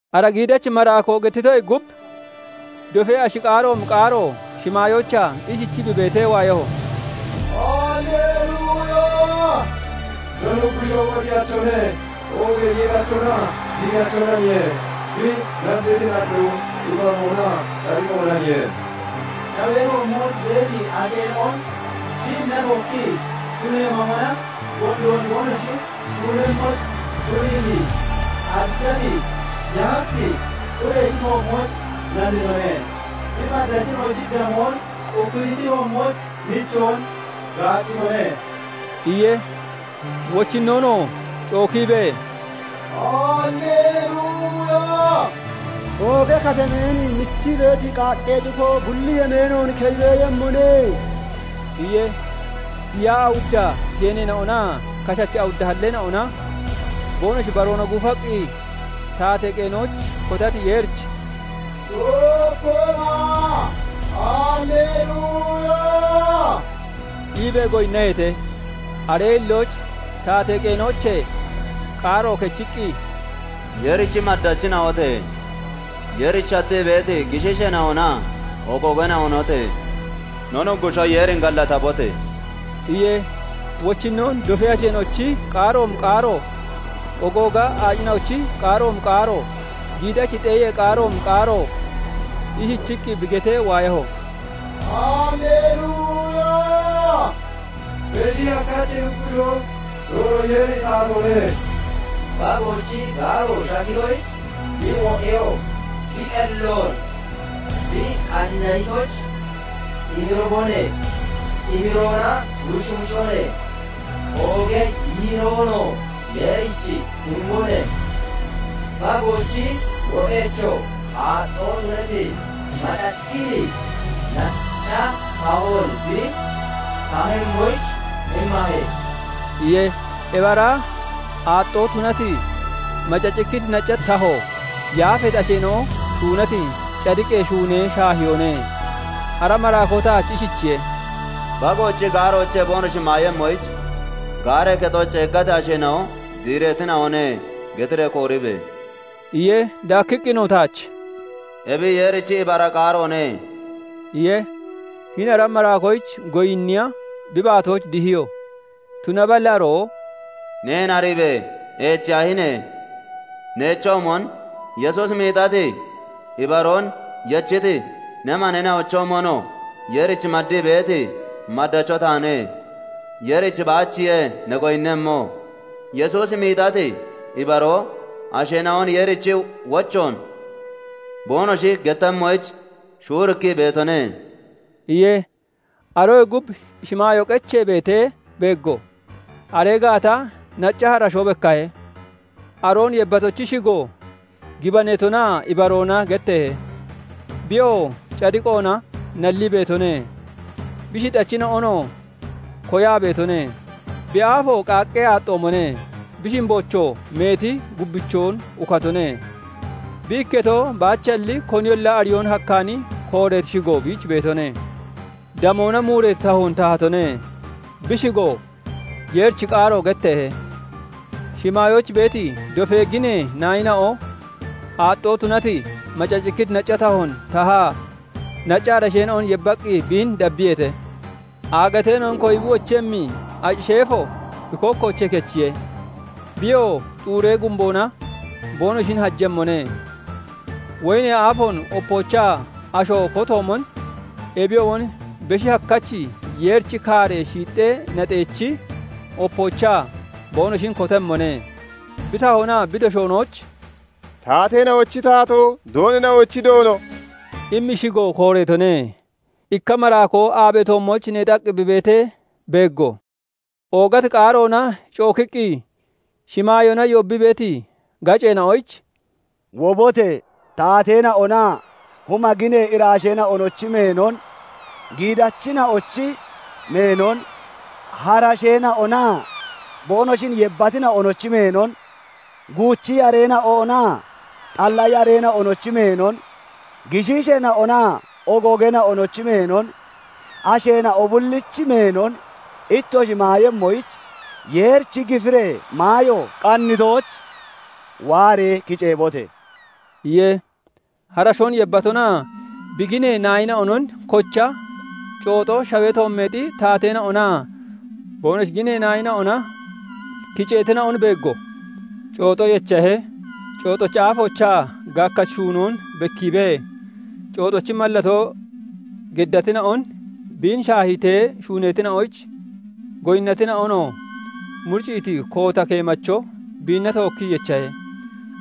Ara giidachi maraakoo gettitoyee gub dofee ashi qaaroomi qaaro shimaayoochaa ishichii bi beetee waayaho; "Hallelluya! No Nuggushoo Wodiyachone! Oogee Yiirachonaa Giidachonaniye. Bi nalliti nalloo ibaroonaa cadiqoonaniye; shawee toommooch beeti asheena'on biinna tookki shunee mamona gondoon boonoshi shuunemmoyich tuniiti, arichati yahachi urechi toommooch nallitone; bi maddachina'ochi damoon ukkitichi toommooch nichoon gaaccitone" iye. Wochinnoonoo cookiibee, "Hallelluya! Ooga katameen michii beeti qaaqqee cufoo, bulli yemeenoon keyi beeyemmone" iye. Hiyaa awudda geeneena'onaa kashachi awudda halleena'ona boonoshi baroona guufaqqi taatee qeenooch kotati Yeerich "Tookkona! Hallelluya!" iibee goyinnaheete. Aree hillooch taatee qeenoochee qaaro kechiqqi, "Yeerichi maddachina'ote! Yeerich shattii beeti gishiisheena'onaa ogoogeena'onote! No Nuggushoo Yeerin gallatabote!" iye. Wochinnoon dofee asheena'ochi qaaroomi qaaro, ogooga aacina'ochi qaaroomi qaaro, giidachi xeeyee qaaroomi qaaroo ishichiqqi bi getee waayaho:- "Hallelluya! Beshi Hakkachi Nuggushoo Doono Yeeri taatatone. Bagoochi gaaro shaggitoyich, bi wo'eyoo bi qelloon bi qanniitoyich emiribone; emiroona wucwucone; oogee yiiroonoo Yeerich imbone. Bagoochi wo'echoo aaxxoo tunati, macacikkiti nacca tahoon bi tahemmoyich immahe" iye. Ebi ara aaxxoo tunati, macacikkiti nacca taho yaafeeti asheena'o shuunati cadiqee shuunee shaahiyoone. Ara maraakoo taach ishichiye:- " 'Bagoochi gaaroochee boonoshi maayemmoyich gaaree kexooch ceeggati asheena'o diireetina'one' getiree kooribe!" iye. Daakkiqqinoo taach "Ebi Yeerichi ibara qaaroone" iye. Hini ara maraakoyich goyinniya bi baatooch dihiyo; tunaballi aroo "Neen ariibe! Eechiyaahine! Neechoomon, Yesuusi miixati ibaroon yechiti ne maneena'ochoomonoo Yeerich maddii beeti maddacho taane; Yeerich baachiye ne goyinnemmo. Yesuusi miixati ibaroo asheena'on Yeerichi wochoon boonoshi gettemmoyich shuurikkii beetone" iye. Aroyee gub shimaayoo qechee beetee beeggo; aree gaata nacca harashoo bekkahe; aroon yebbatochi shigo "Gibaneetonaa Ibaroona" getteehe; biyoo cadiqoona nallii beetone; bi shixachina'onoo koyaa beetone. Bi aafo qaaqqee aaxxoomone; bi shimboochoo meeti gubbichoon ukatone; bi ikketo baachalli koniyolla ariyoon hakkaani kooreeti shigo biich beetone. Damoona muureeti tahoon tahatone; bi shigoo "Yeerichi Qaaro" getteehe. Shimaayooch beeti dofee ginee naayina'o aaxxoo tunati, macacikkiti nacca tahoon tahaa, nacca harasheena'on yebbaqqi biin dabbiyeete. Aagateena'on koyi bi wochemmi aci sheefo bi kookkoochee kechiye; biyoo xuuree gumboona boonoshin hajemmone; woyinee aafoon opoochaa asho kotoomon, ebiyoomon Beshi Hakkachi Yeerichi kaaree shiixxee naxeechi opoochaa boonoshin kotemmone. Bi tahoonaa bi doshoonooch "Taateena'ochi Taatoo, Doonina'ochi Doono" immi shigo kooreetone. Ikka maraakoo aabee toommooch neexaqqi bi beetee beeggo; oogati qaaroona cookiqqi shimaayoona yoobbii beeti gaceena'oyich "Wobote! Taateena'onaa huma ginee iraasheena'onochi meenon, giidachina'ochi meenon, harasheena'onaa boonoshin yebbatina'onochi meenon, guuchi yareena'onaa xalla yareena'onochi meenon, gishiisheena'onaa ogoogeena'onochi meenon, asheena'o bullichi meenon ittoshi maayemmoyich, Yeerichi gifiree maayo qannitooch waaree kiceebote!" iye. Harashoon yebbatonaa bi ginee naayina'onon kocha cooxo, shawee toommeexi taateena'onaa boonoshi ginee naayina'ona kiceetina'on beeggo. Cooxo yechahe; cooxochi aafoochaa gaakkachi shuunoon bekkiibee, cooxochi mallatoo geddatina'on, biin shaahiitee shuuneetoyich goyinnatina'onoo muricciiti koota keemacho biinna tookkii yechahe;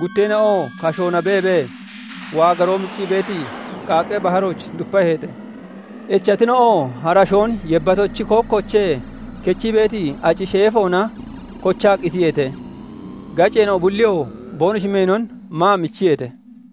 gutteena'oo kashoona beebee waagaroo miccii beeti qaaqqee baharooch dupaheete. Echatina'oo harashoon yebbatochi kookkoochee kechii beeti aci sheefoona kochaa qitiyeete; gaceena'o bulliyoo boonoshi meenon maa michiyeete.